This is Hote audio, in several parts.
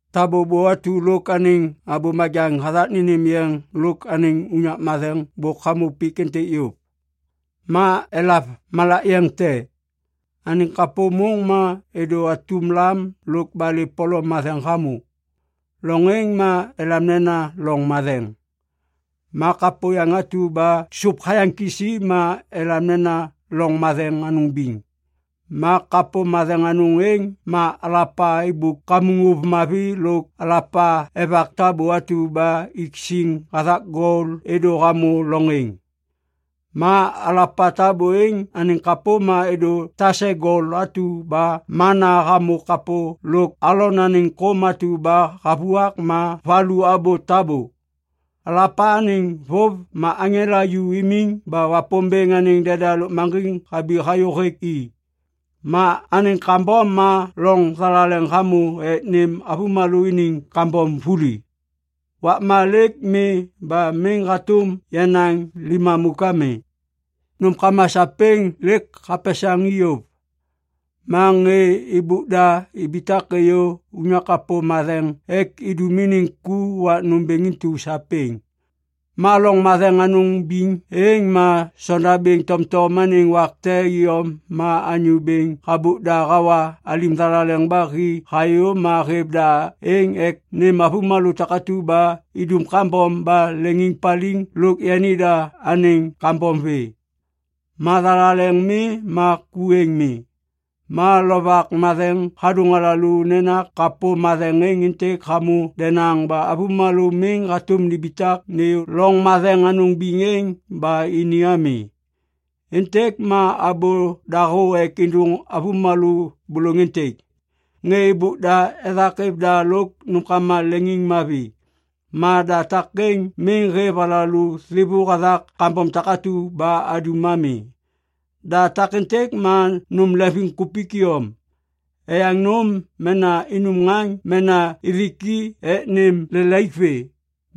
Tabô bô atu lôk anêŋ abô majaŋ hathak nênêm yeŋ lôk anêŋ unyak matheŋ bôk hamô pik êntêk yôv. Ma elav malak yeŋ te. Anêŋ kapô môŋ ma êdô atum lam lôk balê polom matheŋ hamô. Loŋ êŋ ma elam nena Loŋ Matheŋ. Ma kapô yaŋ atu ba sôp hayaŋ kisi ma elam nena Loŋ Matheŋ Anôŋ Biŋ. Ma kapô matheŋ anôŋ êŋ ma alapa êmbôk kamuŋ ôv mavi lôk alapa evak tabô atu ba ik siŋ hathak gol êdô hamô loŋ êŋ. Ma alapa tabô êŋ anêŋ kapô ma êdô tase gol atu ba mana hamô kapô lôk Alon anêŋ kôm atu ba havuak ma valu abô tabô. Alapa anêŋ vôv ma aŋela ju imiŋ ba Wapômbêŋ anêŋ deda lôkmaŋgiŋ habi hayô hêk i. Ma anêŋ ŋgabôm ma loŋ thalaleŋ hamô ek nêm avômalô iniŋ kambom vuli. Wakma lêk mi ba miŋ hatôm yanaŋ limamôk ami. Nômkama sapêŋ lêk hapesaŋ i yôv, ma ŋê êbôk da ibitak êyô unyak kapô matheŋ ek nindum iniŋ ku wak nômbêŋ intu sapêŋ. Ma Loŋ Matheŋ Anôŋ Biŋ êŋ ma sonda bêŋ tomtom anêŋ wak te iyom ma anyô bêŋ habôk da hawa alim thalaleŋ ba hi hayô ma hêv da êŋ ek nêm avômalô takatu ba idum kambom ba leŋiŋpaliŋ lôk yanida anêŋ kambom vê. Ma thalaleŋ mi ma ku êŋ mi. Ma Lovak Matheŋ hadôŋ alalô nena kapô matheŋ êŋ êntêk hamô denaŋ ba avômalô miŋ hatôm nimbitak nêyô Loŋ Matheŋ Anôŋ Biŋ êŋ ba ini ami. Êntêk ma abô dahô ek êdôŋ avômalô bôlôŋ êntêk. Ŋê êbôk da ethak êv da lôk nômkama leŋiŋmavi. Ma da takêŋ miŋ hêv alalô thêvô hathak kambom takatu ba adum ami. Da takêntêk ma nôm leŋviŋkupik iyom, eyaŋ nôm mena inum ŋaŋ mena ithik i ek nêm lelaik vê.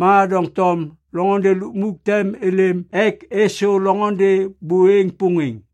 Ma doŋtom loŋôndê lukmuk tem êlêm ek êsô loŋôndê bô êŋ pôŋêŋ.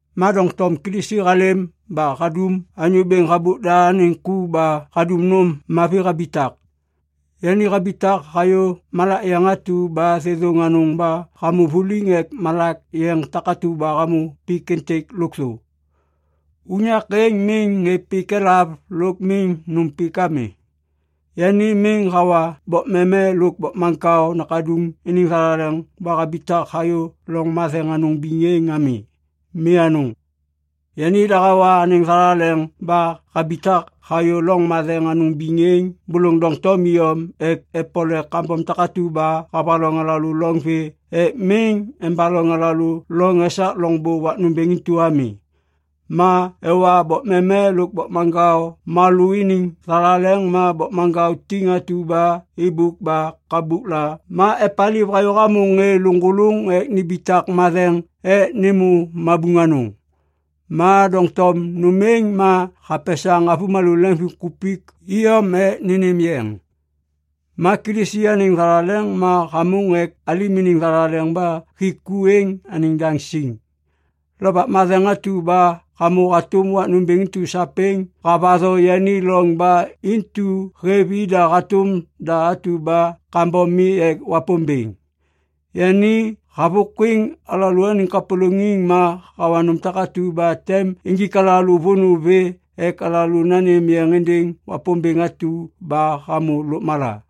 Ma doŋtom Kilisi halêm ba hadum anyô bêŋ habôk da anêŋ ku ba hadum nôm mavi habitak. Yani habitak hayô malak yeŋ atu ba thêthôŋ anôŋ ba hamô vuliŋ ek malak yeŋ takatu ba hamô pik êntêk lôkthô. Unyak êŋ miŋ ŋê pik elav lôk miŋ nôm pik ami. Yani miŋ hawa bokmeme lôk bokmaŋkao nakaduŋ iniŋ thalaleŋ ba habitak hayô Loŋ Matheŋ Anôŋ Biŋ êŋ ami. Mi anôŋ. Yanida hawa anêŋ thalaleŋ ba habitak hayô Loŋ Matheŋ Anôŋ Biŋ êŋ bôlôŋ doŋtom iyom ek epole kambom takatu ba havaloŋ alalô loŋ vê ek miŋ embaloŋ alalô loŋ esak loŋbô wak nômbêŋ intu ami. Ma ewa bokmeme lôk bokmaŋkao malô iniŋ thalaleŋ ma bokmaŋkao tiŋ atu ba êbôk ba kabukla ma epaliv hayô hamô ŋê lôŋgôlôŋ ek nimbitak matheŋ ek nêmô mabuŋ anôŋ. Ma doŋtom nôm êŋ ma hapesaŋ avômalô leŋviŋkupik iyom ek nênêm yeŋ. Ma Kilisi anêŋ thalaleŋ ma hamôŋ ek alim iniŋ thalaleŋ ba hik ku êŋ anêŋ daŋ siŋ. Lovak Matheŋ atu ba hamô hatôm wak nômbêŋ intu sapêŋ havatho yani loŋ ba intu hêv ida hatôm da atu ba kambom mi ek Wapômbêŋ. Yani havôkwiŋ alalôaniŋ kapôlôŋiŋ ma hawa nôm takatu ba tem injik alalô vônô vê ek alalô nanêm yeŋ êndêŋ Wapômbêŋ atu ba hamô lôkmala.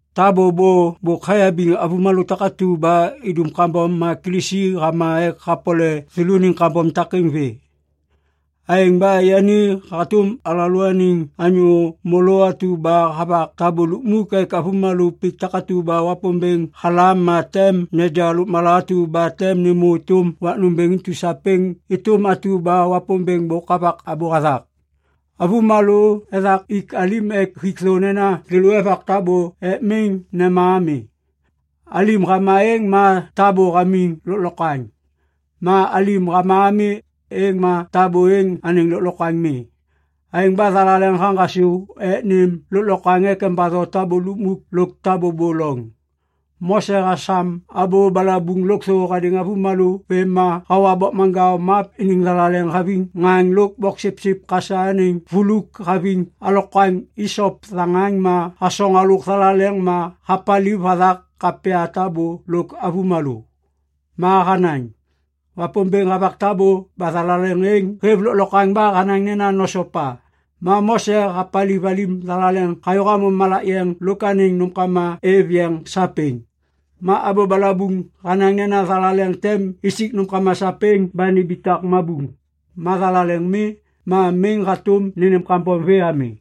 Tabô bô bôk hayabiŋ avômalô takatu ba idum kambom ma Kilisi hama ek hapole thêlôniŋ kambom takêŋ vê. Aêŋ ba yani hatôm alalôaniŋ anyô môlô atu ba havak tabô lukmuk ek avômalô pik takatu ba Wapômbêŋ halam ma tem neja lôkmala atu ba tem nêmô êtôm wak nômbêŋ intu sapêŋ êtôm atu ba Wapômbêŋ bôk havak abô hathak. Avômalô ethak ik alim ek hik thô nena thêlô evak tabô ek miŋ nema ami. Alim hama êŋ ma tabô hamiŋ lôklokwaŋ. Ma alim hama ami, êŋ ma tabô êŋ anêŋ lôklokwaŋ mi. Aêŋ ba thalaleŋ haŋgasô ek nêm lôklokwaŋ ek embatho tabô lukmuk lôk tabô bô loŋ. Mose hasam abô balabuŋ lôkthô hadêŋ avômalô vêm ma hawa bokmaŋkao map iniŋ thalaleŋ haviŋ ŋaŋ lôk boksipsip kasa anêŋ vuluk haviŋ alokwaŋ isop thaŋaŋ ma hasoŋ halôk thalaleŋ ma hapaliv hathak kapya tabô lôk avômalô. Ma hanaŋ, “Wapômbêŋ havak tabô ba thalaleŋ êŋ hêv lôklokwaŋ ba hanaŋ nena nosopa.” Ma Mose hapaliv alim thalaleŋ hayô hamô malak yeŋ lôk anêŋ nômkama êv yeŋ sapêŋ. Ma abô balabuŋ hanaŋ nena thalaleŋ tem isik nômkama sapêŋ ba nimbitak mabuŋ. Ma thalaleŋ mi, ma miŋ hatôm nênêm kambom vê ami.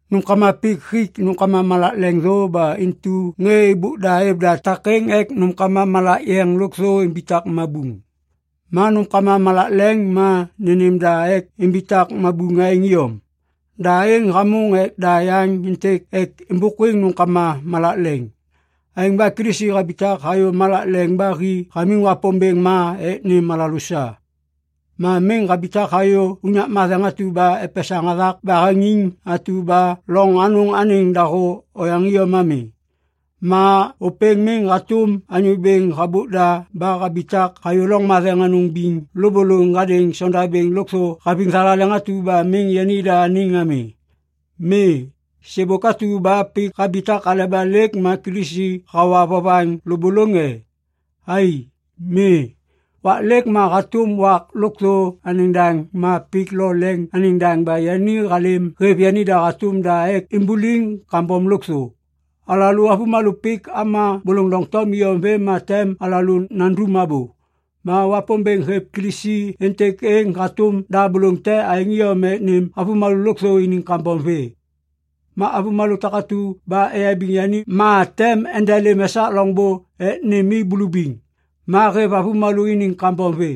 Nômkama pik hik nôm malak leŋ thô ba intu ŋê êbôk da êv da takêŋ ek nômkama malak yeŋ lôkthô imbitak mabuŋ. Ma nômkama malak leŋ ma nênêm da ek imbitak mabuŋ aêŋ iyom. Da êŋ hamôŋ ek da yaŋ êntêk ek êmbôkwiŋ nômkama malak leŋ. Aêŋ ba Kilisi habitak hayô malak leŋ ba hi hamiŋ Wapômbêŋ ma ek nêm alalô sa. Ma miŋ habitak hayô unyak matheŋ atu ba epesaŋ hathak baheŋiŋ atu ba loŋ anôŋ anêŋ dahô oyaŋ iyom ami. Ma ôpêŋ miŋ hatôm anyô bêŋ habôk da ba habitak hayô Loŋ Matheŋ Anôŋ Biŋ lôbôlôŋ hadêŋ sondabêŋ lôkthô haviŋ thalaleŋ atu ba miŋ yanida anêŋ ami. Mi! Sêbôk atu ba pik habitak aleba lêk ma Kilisi hawa vovaŋ lôbôlôŋ e? Ai! Mi! Wak lêk ma hatôm wak lôkthô anêŋ daŋ ma pik lo leŋ anêŋ daŋ ba yani halêm hêv yanida hatôm da ek imbuliŋ kambom lôkthô. Alalô avômalô pik ama bôlôŋ doŋtom iyom vêm ma tem alalô nandum abô. Ma Wapômbêŋ hêv Kilisi êntêk êŋ hatôm da bôlôŋ te aêŋ iyom ek nêm avômalô lôkthô iniŋ kambom vê. Ma avômalô takatu ba eyabiŋ yani ma tem endelêm esak loŋbô ek nêm i bulubiŋ. Ma hêv avômalô iniŋ kambom vê,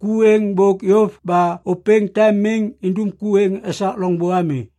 ku êŋ bôk yôv ba ôpêŋ tem miŋ indum ku êŋ esak loŋbô ami.